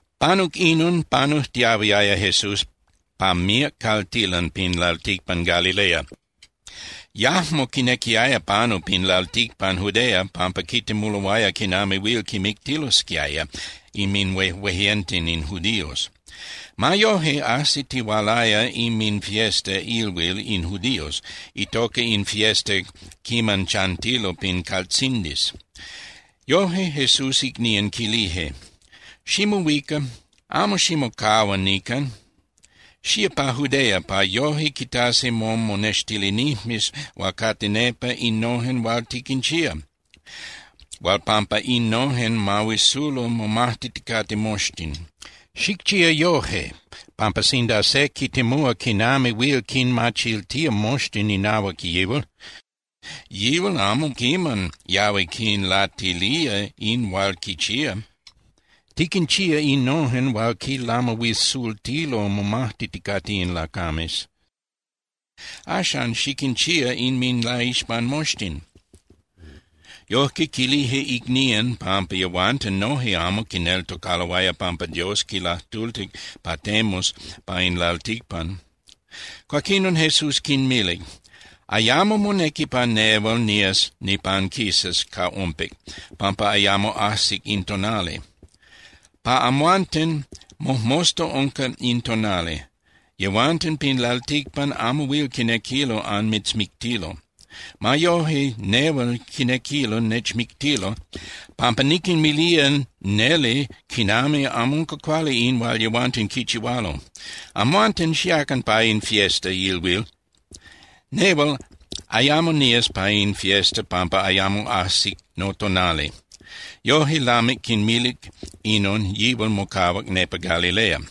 Panuc inon, panujtiahuiaya Jesús pa míac caltilan pin lalticpan Galilea. Yajmo quinequiaya panu pin lalticpan Judea pampa quitemuloaya quinami huil quimictilosquiaya inminhuejueyenten in judíos. Ma yoje, ajsitihualaya inminfiesta (ilhuil) in judíos itoca in fiesta quiman chantilo pin caltzindis. Yoje, Jesús icnían quilije: —Ximohuica, amo ximocahua nican, xía pa Judea, pa yoje quitasi momonextilinijmes hual cate nepa innojen hual tiquinchía, hual pampa innojen mahuisulo momajtiticate moxtin. Xicchía yoje, pampa sinda se quitemúa quinami huil quinmachiltía moxtin inahuac yihual, yihual amo quiman yahui quinlatilía in hual quichía. Tiquinchía innojen hual quinlamahuisultilo momajtiticate in lacames. Axan, xiquinchía inminlaixpan moxtin. Yojque quilije icnían pampa yehuanten noje amo quineltocaloaya pampa Dios quilajtultic pa temus pa in lalticpan. Cuaquinon Jesús quinmilic: —Ayamo monequi pa nehual nías nipanquisas ca ompic, pampa ayamo ajsic in tonali. Pa amhuanten mojmosta unca in tonali. Yehuanten pin lalticpan amo huil quinequilo anmitzmictilo. Ma yoje, nehual quinequilo nechmictilo, pampa niquinmilía neli quinami amo unca cuali in hual yehuanten quichihualo. Amhuanten xiacan pa in fiesta (ilhuil). Nehual ayamo nías pa in fiesta pampa ayamo ajsic notonali. Yoje, lamic quinmilic inon, yihual mocahuac nepa Galilea.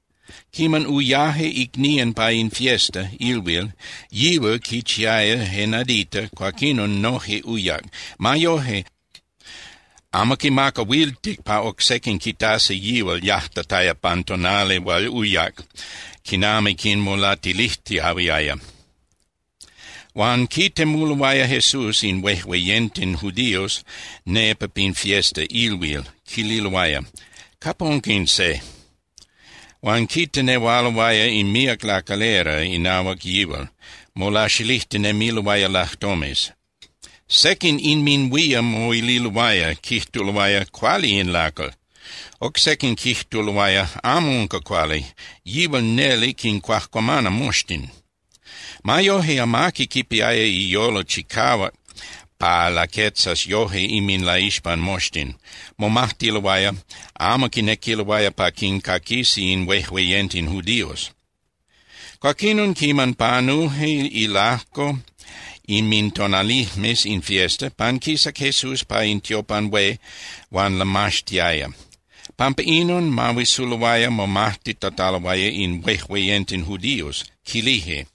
Quiman uyaje icnían pa in fiesta (ilhuil), yihual quichiaya je nadita, cuaquinon noje uyac. Ma yoje, amo quimacahuiltic pa oc sequin quitasi yihual yajtataya pan tonali hual uyac, quinami quinmolatilijtiahuiaya. Huan quitemuloaya Jesús in huejueyenten judíos nepa pin fiesta (ilhuil), quililoaya: —¿Capa unca in se? Huan quitenehualoaya in míac lacalera inahuac yihual, molaxilijtinemiloaya lajtomes. Sequin inminhuían moililoaya, quijtuloaya: “Cuali in lacal.” Oc sequin quijtuloaya: “Amo unca cuali. Yihual neli quincuajcuamana moxtin.” Ma yoje, amaqui quipiaya iyolo chicahuac pa laquetzas yoje inminlaixpan moxtin. Momajtiloaya, amo quinequiloaya pa quincaquisi in huejueyenten judíos. Cuaquinon quiman panuje ilajco inmintonalijmes in fiesta, panquisac Jesús pa in tiopan hué huan lamaxtiaya. Pampa inon, mahuisuloaya momajtitataloaya in huejueyenten judiós, quilije: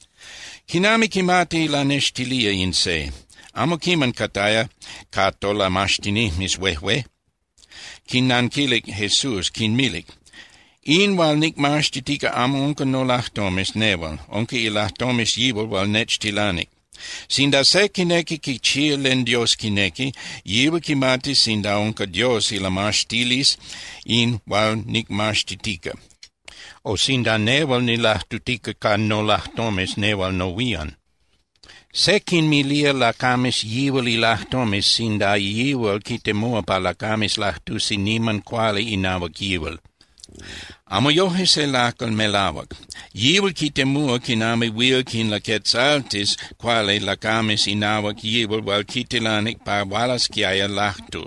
—¿Quinami quimati lanextilía in se? Amo quiman cataya ca tolamaxtinijmes huejué. Quinnanquilic Jesús, quinmilic: —In hual nicmaxtitica amo unca nolajtomes nehual, unca ilajtomes yihual hual nechtilanic. Sinda se quinequi quichía len Dios quinequi, yihual quimatis sinda unca Dios ilamaxtilisli in hual nicmaxtitica, o sinda nehual nilajtutica ca nolajtomes nehual nohuían. Se quinmilía lacames yihual ilajtomes, sinda yihual quitemuá pa lacames lajtusi niman cuali inahuac yihual. Amo yoje se lacal melahuac. Yihual quitemúa quinami huil quinlaquetzaltis cuali lacames inahuac yihual hual quitilanic pa hualasquiaya lajtu.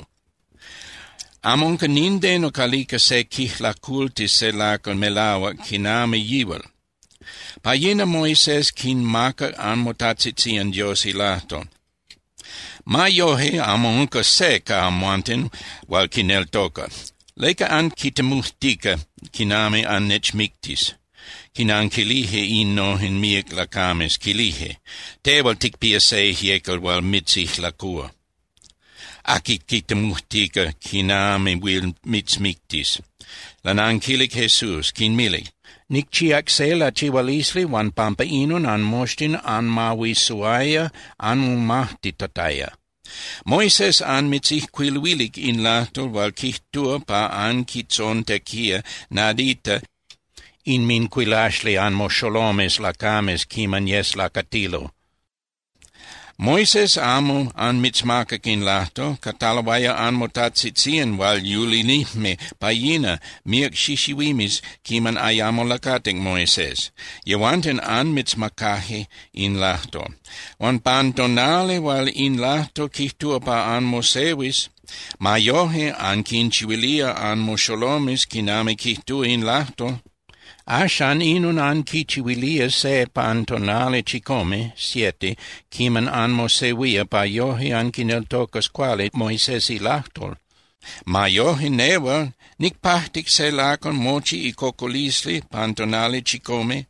Amo unca nindeno calica se quijlacultis se lacal melahuac quinami yihual. Pa yina Moisés quinmacac anmotajtzitzían Dios ilajtol. Ma yoje amo unca se ca amhuanten hual quineltoca. ¿Leca anquitemujtica quinami annechmictis? Quinanquilije innojen míac lacames, quilije: —Tehual ticpía se ijyecal hual mitzijlacúa. ¿Aqui quitemujtica quinami huil mitzmictis? Lananquilic Jesús, quinmilic: —Nicchíac se lachihualisli huan pampa inon anmoxtin anmahuisuaya anmomajtitataya. Moisés anmitzijcuiluilic in lajtol hual quijtúa pa anquitzontequía nadita inmincuilaxli anmoxolomes lacames quiman yes lacatilo. Moisés amo anmitzmacac in lajtol. Cataloaya anmotajtzitzían hual yulinijme pa yina míac xixihuimes quiman ayamo lacatic Moisés, yehuanten anmitzmacaje in lajtol. Huan pan tonali hual in lajtol quijtúa pa anmosehuis, ma yoje anquinchihuilía anmoxolomes quinami quijtúa in lajtol. Axan, inon anquichihuilía se pan tonali chicome (siete) quiman anmosehuía pa yoje anquineltocas cuali Moisés ilajtol. Ma yoje, nehual, nicpajtic se lacal mochi icocolisli pan tonali chicome,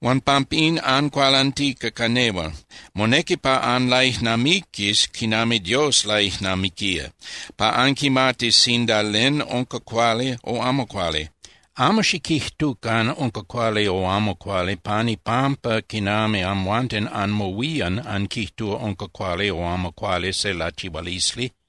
huan pampín ancualantica ca nehual. Monequi pa anlaijnamiquis quinami Dios laijnamiquía pa anquimatis sinda len unca cuali o amo cuali. Amo xiquijtucan unca cuali o amo cuali pan ipampa quinami amhuanten anmohuían anquijtúa unca cuali o amo cuali se lachihualisli.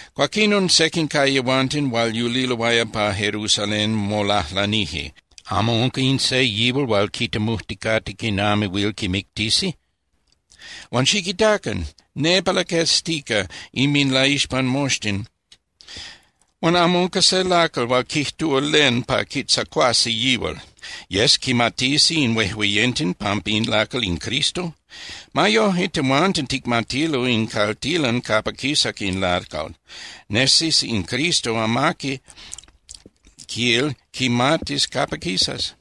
Cuaquinon sequin ca yehuanten hual yuliloaya pa Jerusalén molajlanije: —¿Amo unca in se yihual hual quitemujticate quinami huil quimictisi? Huan ¡xiquitacan! Nepa laqueztica inminlaixpan moxtin huan amo unca se lacal hual quijtúa len pa quitzacuasi yihual. ¿Yes quimatisi in huejueyenten pampa in lacal in Cristo? Ma yoje, tehuanten ticmatilo in caltilan capa quisac in lacal. Nesis in Cristo, amaqui, quil, quimatis capa quisas.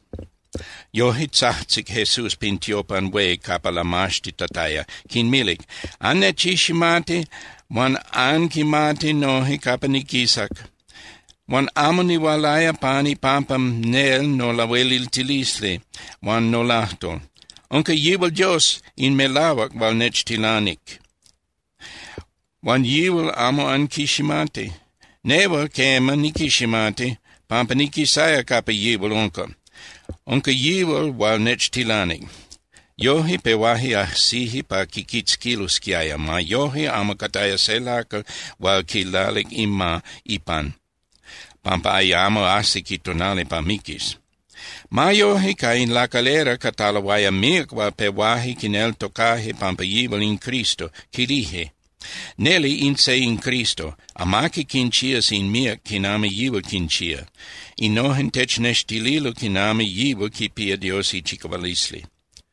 Yoje, tzajtzic Jesús pin tiopan hué capa lamaxtitataya, quinmilic: —¡Annechiximati huan anquimati noje capa niquisac! Huan amo nihualaya pan ipampa nel nolahueliltilisli huan nolajtol. Unca yihual Dios in melahuac hual nechtilanic, huan yihual amo anquiximati. Nehual, quema, niquiximati, pampa niquisaya capa yihual unca. Unca yihual hual nechtilanic. Yoje, pehuaje ajsije pa quiquitzquilosquiaya. Ma yoje, amo cataya se lacal hual quilalic ima ipan, pampa ayamo ajsic itonali pa miquis. Ma yoje, ca in lacalera cataloaya míac hual pehuaje quineltocaje pampa yihual in Cristo, quilije: —Neli in se in Cristo. Amaqui quinchías in míac quinami yihual quinchía. Innojen technextililo quinami yihual quipía Dios ichicahualisli.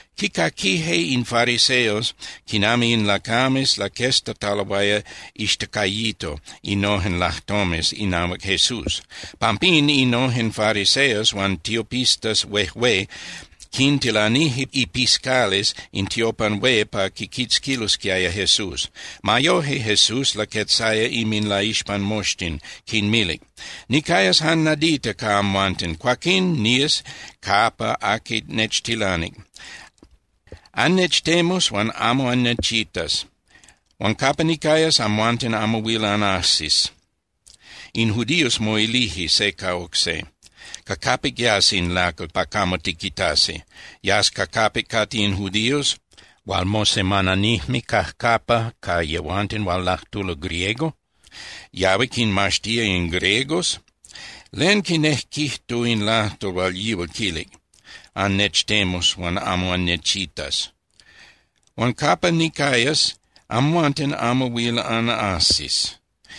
Quicaquije in fariseos quinami in lacames laqueztataloaya ixtacayito innojen lajtomes inahuac Jesús. Pampín innojen fariseos huan tiopistas huejué quintilanije ipiscales in tiopan hué pa quiquitzquilosquiaya Jesús. Ma yoje, Jesús laquetzaya inminlaixpan moxtin, quinmilic: —Nicayas jan nadita ca amhuanten, cuaquín nías capa aqui nechtilanic. Annechtemus, huan amo annechitas. Huan capa nicayas, amhuanten amo huil anajsis. In judíos moilije se ca oc se: —¿Ca capic yas in lacal pa camo tiquitasi? ¿Yas ca capic cate in judíos hual mosemananijme cajcapa ca yehuanten hual lajtulo griego? ¿Yahui quinmaxtía in griegos? ¿Len quinejquijtu in lajtol hual yíal quilic: “Annechtemus, huan amo annechitas. Huan capa nicayas, amhuanten amo huil anajsis”?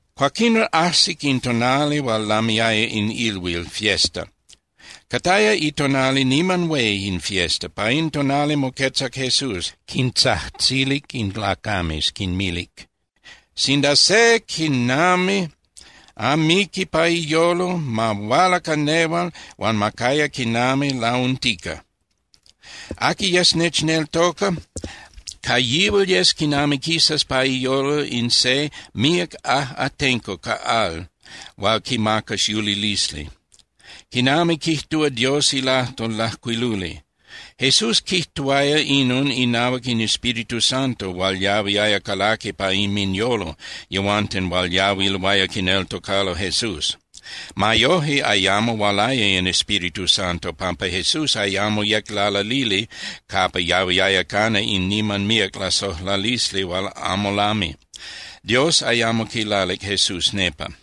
Cuaquinon ajsic in tonali hual lamiaya in ilhuil (fiesta), cataya itonali niman hué in fiesta. Pa in tonali moquetzac Jesús, quintzajtzilic in lacames, quinmilic: —Sinda se quinami amiqui pa iyolo, ma huala ca nehual, huan ma caya quinami launtica. Aqui yes nechneltoca, ca yihual yes quinami quisas pa iyolo in se míac ajꞌatenco ca al hual quimacas yulilisli, quinami quijtúa Dios ilajtol lajcuiluli. Jesús quijtuaya inon inahuac in Espíritu Santo hual yahuiaya calaqui pa inminyolo yehuanten hual yahuiloaya quineltocalo Jesús. Ma yoje, ayamo hualaya in Espíritu Santo, pampa Jesús ayamo yec lalalili capa yahuiaya cana in niman míac lasojlalisli hual amo lami. Dios ayamo quilalic Jesús nepa.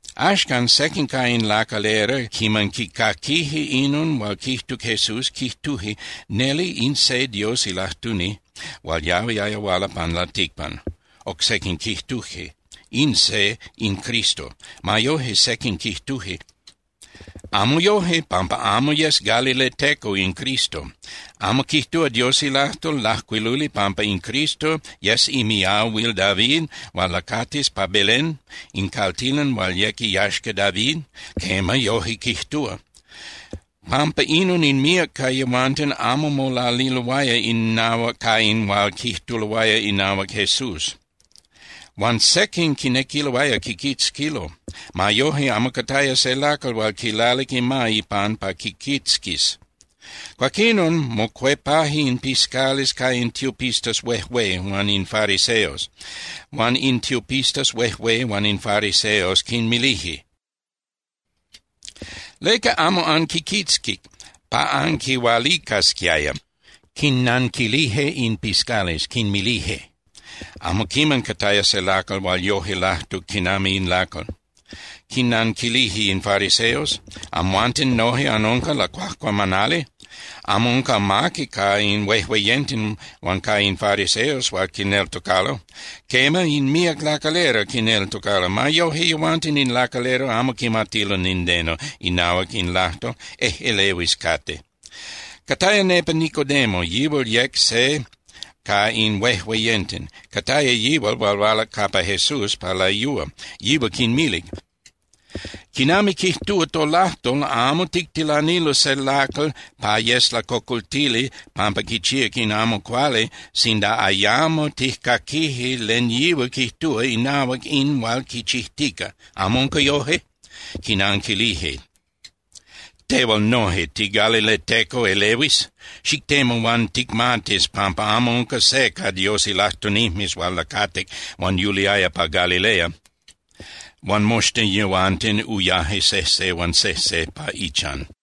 Axcan, sequin ca in lacalera, quiman quicaquije inon hual quijtuc Jesús, quijtuje: —Neli in se Dios ilajtuni hual yahuiaya huala pan lalticpan. Oc sequin quijtuje: —In se in Cristo. Ma yoje, sequin quijtuje: —Amo yoje, pampa amo yes galileteco in Cristo. ¿Amo quijtúa Dios ilajtol lajcuiluli pampa in Cristo yes imiahuil David huan lacatis pa Belén, in caltilan hual yec iyaxca David? Quema, yoje quijtúa. Pampa inon in míac ca yehuanten amo molaliloaya innahuac ca in hual quijtuloaya inahuac Jesús. Huan sequin quinequiloaya quiquitzquilo. Ma yoje, amo cataya se lacal hual quilalic ima ipan pa quiquitzquis. Cuaquinon mocuepaje in piscales ca in tiopistas huejué huan in fariseos. Huan in tiopistas huejué huan in fariseos quinmilije: —¿Leca amo anquiquitzquic pa anquihualicasquiaya? Quinnanquilije in piscales, quinmilije: —¡Amo quiman cataya se lacal hual yoje lajtuc quinami in lacal! Quinnanquilije in fariseos: —¿Amhuanten noje anunca lacuajcuamanali? Amo unca amaqui ca in huejueyenten huan ca in fariseos hual quineltocalo. Quema, in míac lacalera quineltocalo. Ma yoje, yehuanten in lacalera amo quimatilo nindeno inahuac in lajtol. Ejꞌelehuis cate. Cataya nepa Nicodemo, yihual yec se ca in huejueyenten. Cataya yihual hual hualac capa Jesús pa layúa. Yihual quinmilic: —Quinami quijtúa tolajtol, amo tictilanilo se lacal pa yes lacocoltili pampa quichíac in amo cuali sinda ayamo tijcaquije len yihual quijtúa inahuac in hual quichijtica. ¿Amo unca yoje? Quinanquilije: —¿Tehual noje, tigalileteco elehuis? Xictemu huan ticmatis pampa amo unca se ca Dios ilajtunijmes hual lacatic huan yuliaya pa Galilea. Huan moxtin yehuanten uyaje sejse huan sejse pa ichan.